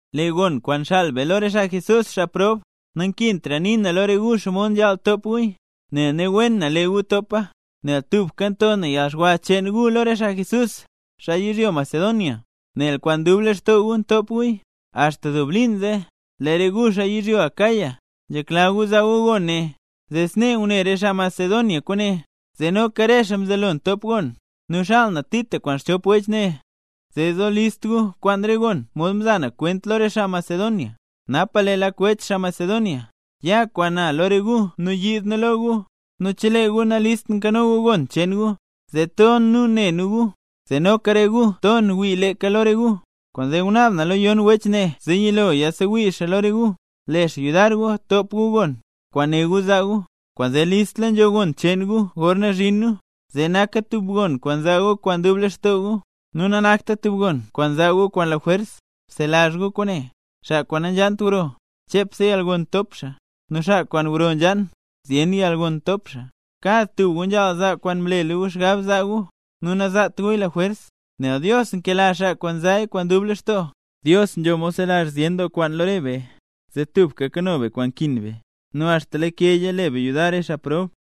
Lee gon kwaan xaal be lo re xaa mle nambey Jesús, xaa prob, nankintra nii na lo re gu xomod nzhaal top guya, nel ne wen na lee gu topa. Nel tubka nto na yalxwa cheen gu lo re xaa Jesús, xaa yizhyo Macedonia, nel kwaan dub lextoo gu ntop guya. Axta dub liin zee, lee re gu xaa yizhyo Acaya, nzhekla gu zaa gu gon ne. Zee snee ngune re xaa Macedonia kwaane, zee noka re xaa mzelo ntop gon. Nu xaal na Tito kwaan xchop wech ne, zee zo list gu kwaan re gon mod mza na kwent lo re xaa Macedonia, napa lee lak wech, xaa Macedonia, ya kwaan na lo re gu nu yiid nu lo gu. Nu chelee gu nalist nkano gu gon cheen gu, zee ton nu ne nu gu, zee noka re gu ton wii leeka lo re gu. Kwaanzee ngunaab na lo yon wech ne zee yilo yasewii xaa lo re gu, le xaa yudar gu top gu gon, kwaan né gu zaa gu. Kwaanzee nzhaal listla nzho gon cheen gu gorna zhin nu, zee naka tub gon kwaan zaa gu kwaan dub lextoo gu, nu nanakta tub gon kwaan zaa gu kwaan lajwers. Bselazh gu kwaane: “Xaa kwaan nanzhaant gro, chepse yalgon ntop xaa; nu xaa kwaan gro nzhaan, zyen yalgon ntop xaa”. Kad tub gu nzhaal zaa kwaan mlela gu xgab zaa gu, nu nazaat guya lajwers, nel Dios nkela xaa kwaan nzaaya kwaan dub lextoo. Dios nzho mod zelazh zyen doo kwaan lo re be, zee tubka kano be kwaan nkin be, nu axta lakeya le be yudar re xaa prob.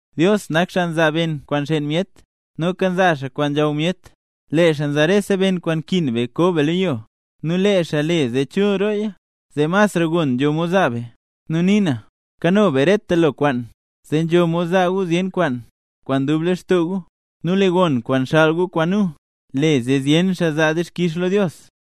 Dios nak xaa nzaa ben kwaan nxeen myet, noka nzaa xaa kwaan nzhaw myet. Lee xaa nzaa lo re be rese ben kwaan nkin be ko be lo yo, nu lee xaa le zee chul rooya, zee masra gon nzho mod zaa be. Nu nii na, kano be reta lo kwaan, zee nzho mod zaa gu zyen kwaan, kwaan dub lextoo gu. Nu lee gon kwaan xaal gu kwaan nu, le zee zyen xaa zaa dixkix lo Dios.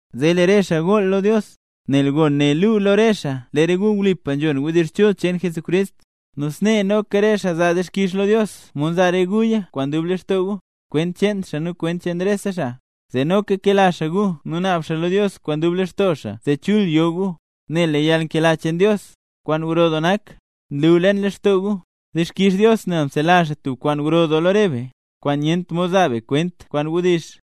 Zee lee re xaa gool lo Dios, nel gon ne luu lo re xaa lee re gu wlipa nzhon wdizh chul cheen Jesucrist. Nu snee noka re xaa zaa dixkix lo Dios mod nzaa re guya kwaan dub lextoo gu, kwent cheen xaa nu kwent cheen rese xaa. Zee noka kela xaa gu nu naab xaa lo Dios kwaan dub lextoo xaa zee chul yo gu, nel lee yalnkela cheen Dios, kwaan gro doo nak, nlu leen lextoo gu. ¡Dixkix Dios nel mzelazh xaa tub kwaan gro doo lo re be, kwaan nyent mod zaa be kwent kwaan wdizh!